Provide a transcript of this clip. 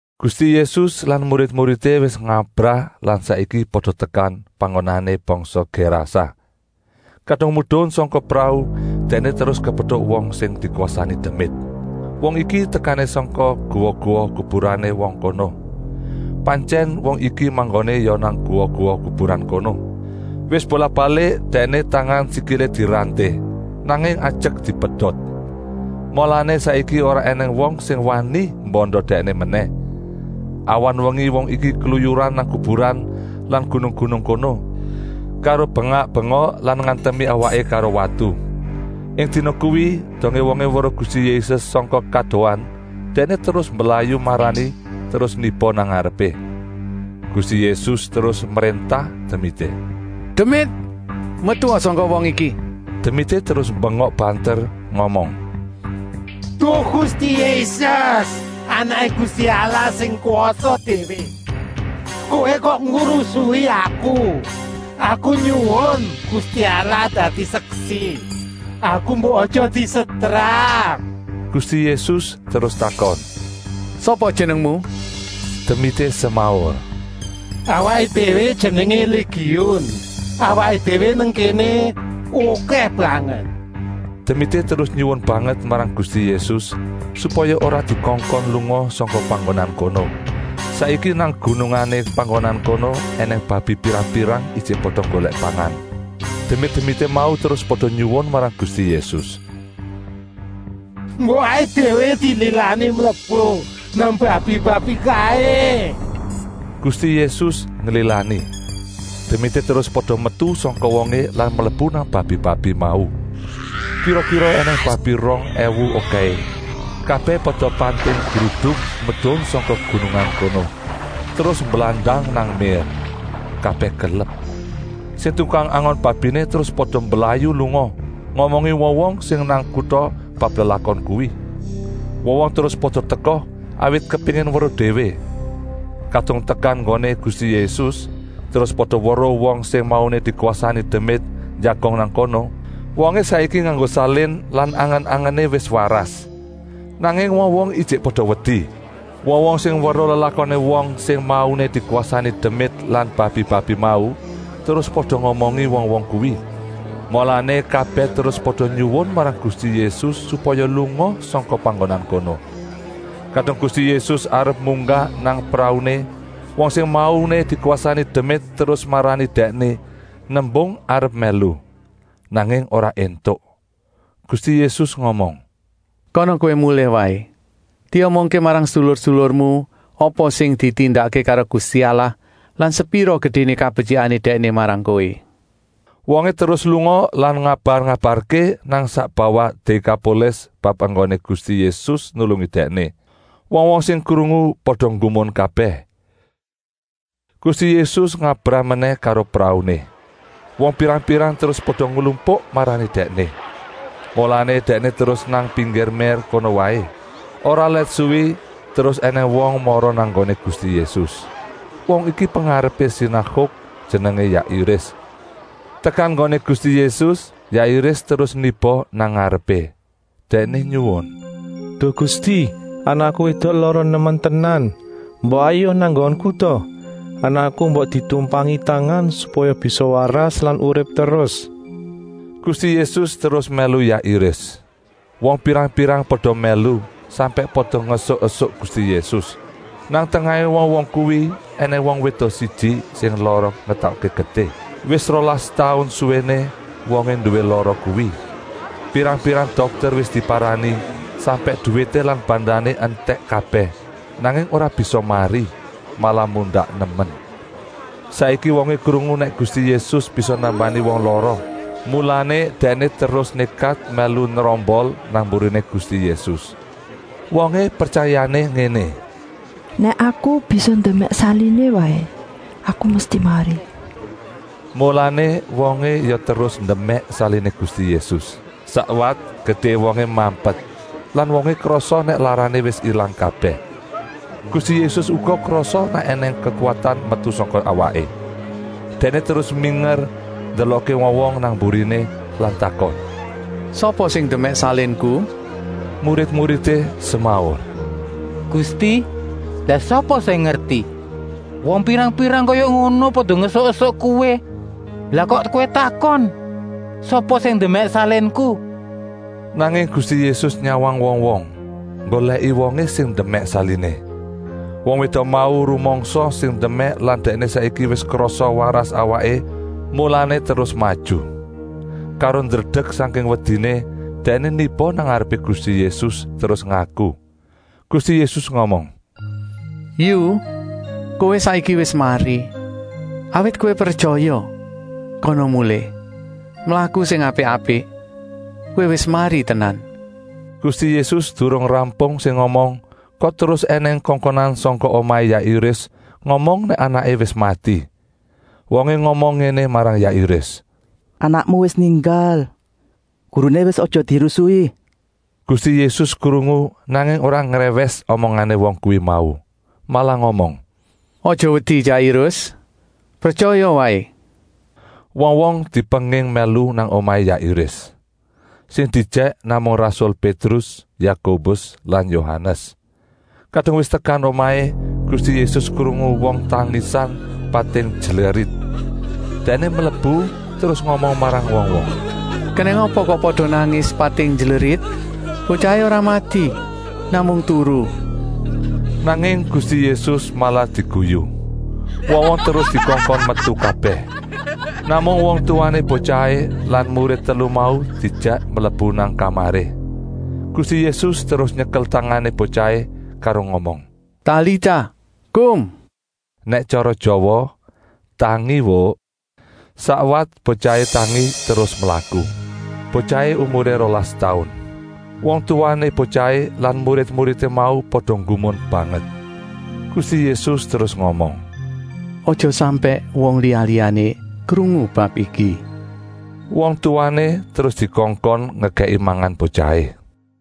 Gusti Yésus lan murid-muridé wis ngabrah lan saiki pada tekan panggonané bangsa Gérasa. Kadung medun sangka prau Dèkné terus kepetuk wong sing dikwasani demit. Wong iki tekané sangka guwa-guwa kuburané wong kono. Pantyèn wong iki manggoné ya nang guwa-guwa kuburan kono. Wis bolak-balik dèkné tangan-sikilé diranté, nanging ajek dipedot. Mulané saiki ora ènèng wong sing wani mbanda dèkné menèh. Awan-wengi wong iki kluyuran nang kuburan lan gunung-gunung kono, karo bengak-bengok lan ngantemi awaké karo watu. Ing dina kuwi, dongé wongé weruh Gusti Yésus sangka kadohan, dèkné terus mblayu marani terus niba nang ngarepé. Gusti Yésus terus mréntah demité: “Demit, metua sangka wong iki!” Demité terus mbengok banter ngomong: “Duh Gusti Yésus, Anaké Gusti Allah sing kwasa déwé, Kowé kok ngurusi aku. Aku nyuwun, Gusti Allah dadi seksi, aku mbok aja disetrap.” Gusti Yésus terus takon: “Sapa jenengmu?” Demité semaur: “Awaké déwé jenengé Légiun, awaké déwé nang kéné okèh banget.” Demité terus nyuwun banget marang Gusti Yésus, supaya ora dikongkon lunga sangka panggonan kono. Saiki nang gunungané panggonan kono ènèng babi pirang-pirang ijik pada nggolèk pangan. Demit-demité mau terus pada nyuwun marang Gusti Yésus: “Mbok awaké déwé dililani mlebu nang babi-babi kaé.” Gusti Yésus nglilani. Demité terus pada metu sangka wongé lan mlebu nang babi-babi mau. Kira-kira ènèng babi rong èwu okèhé, kabèh pada pating gruduk medun sangka gunungan kono, terus mblandang nang mér. Kabèh kelep. Sing tukang angon babiné terus pada mblayu lunga, ngomongi wong-wong sing nang kuta bab lelakon kuwi. Wong-wong terus pada teka, awit kepéngin weruh déwé. Kadung tekan nggoné Gusti Yésus, terus pada weruh wong sing mauné dikwasani demit njagong nang kono. Wongé saiki nganggo salin lan angen-angené wis waras. Nanging wong-wong ijik pada wedi. Wong-wong sing weruh lelakoné wong sing mauné dikwasani demit lan babi-babi mau terus pada ngomongi wong-wong kuwi. Mulané kabèh terus pada nyuwun marang Gusti Yésus supaya lunga sangka panggonan kono. Kadung Gusti Yésus arep munggah nang prauné, wong sing mauné dikwasani demit terus marani Dèkné, nembung arep mèlu. Nanging ora éntuk. Gusti Yésus ngomong: “Kana kowé mulih waé. Diomongké marang sedulur-sedulurmu apa sing ditindakké karo Gusti Allah lan sepira gedéné kabetyikané Dèkné marang kowé.” Wongé terus lunga lan ngabar-ngabarké nang sak bawah Dékapolis bab enggoné Gusti Yésus nulungi dèkné. Wong-wong sing krungu pada nggumun kabèh. Gusti Yésus ngabrah menèh karo prauné. Wong pirang-pirang terus pada nglumpuk marani Dèkné. Mulané Dèkné terus nang pinggir mér kono waé. Ora let suwi terus ènèng wong mara nang nggoné Gusti Yésus. Wong iki pengarepé sinaguk, jenengé Jairus. Tekan nggoné Gusti Yésus Jairus terus niba nang ngarepé. Dèkné nyuwun: “Duh Gusti, anakku wédok lara nemen tenan. Mbok hayuk nang nggonku ta! Anakku mbok ditumpangi tangan supaya bisa waras lan urip terus.” Gusti Yésus terus mèlu Jairus. Wong pirang-pirang pada mèlu, sampèk pada ngesuk-esuk Gusti Yésus. Nang tengahé wong-wong kuwi ènèng wong wédok siji sing lara ngetokké getih. Wis rolas taun suwéné wongé nduwé lara kuwi. Pirang-pirang dokter wis diparani, sampèk duwité lan bandané entèk kabèh, nanging ora bisa mari, malah mundak nemen. Saiki wongé krungu nèk Gusti Yésus bisa nambani wong lara, mulané dèkné terus nékat mèlu nrombol nang mburiné Gusti Yésus. Wongé pretyaya ngéné: “Nèk aku bisa ndemèk saliné waé, aku mesti mari.” Mulané wongé ya terus ndemèk saliné Gusti Yésus. Sakwat getihé wongé mampet lan wongé krasa nèk larané wis ilang kabèh. Gusti Yésus uga krasa nèk ènèng kekuwatan metu sangka awaké. Dèkné terus minger ndelokké wong-wong nang mburiné lan takon: “Sapa sing ndemèk salinku?” Murid-muridé semaur: “Gusti, lah sapa sing ngerti! Wong pirang-pirang kaya ngono pada ngesuk-esuk Kowé, lah kok Kowé takon: ‘Sapa sing ndemèk salinku?’” Nanging Gusti Yésus nyawang wong-wong, nggolèki wongé sing ndemèk saliné. Wong wédok mau rumangsa sing ndemèk lan dèkné saiki wis krasa waras awaké, mulané terus maju. Karo ndredek sangking wediné, dèkné niba nang ngarepé Gusti Yésus terus ngaku. Gusti Yésus ngomong: “Yu, kowé saiki wis mari, awit kowé pretyaya. Kana mulih. Mlaku sing apik-apik. Kowé wis mari tenan.” Gusti Yésus durung rampung sing ngomong, kok terus ènèng kongkonan sangka omahé Jairus ngomong nèk anaké wis mati. Wongé ngomong ngéné marang Jairus: “Anakmu wis ninggal. Guruné wis aja dirusuhi!” Gusti Yésus krungu, nanging ora ngrèwès omongané wong kuwi mau, malah ngomong: “Aja wedi Jairus, pretyaya waé!” Wong-wong dipenging mèlu nang omahé Jairus. Sing diejèk namung rasul Pétrus, Yakobus lan Yohanes. Kadung wis tekan omahé, Gusti Yésus krungu wong tangisan pating jlerit. Dèkné mlebu terus ngomong marang wong-wong: “Kenèng apa kok pada nangis pating jlerit? Botyahé ora mati, namung turu!” Nanging Gusti Yésus malah diguyu. Wong-wong terus dikongkon metu kabèh. Namung wong tuwané botyahé lan murid telu mau diejèk mlebu nang kamaré. Gusti Yésus terus nyekel tangané botyahé karo ngomong: “Talita kum!” Nèk tyara Jawa: “Tangi wuk!” Sakwat botyahé tangi terus mlaku. (Botyahé umuré rolas taun.) Wong tuwané botyahé lan murid-muridé mau pada nggumun banget. Gusti Yésus terus ngomong: “Aja sampèk wong liya-liyané krungu bab iki.” Wong tuwané terus dikongkon ngekèki mangan botyahé.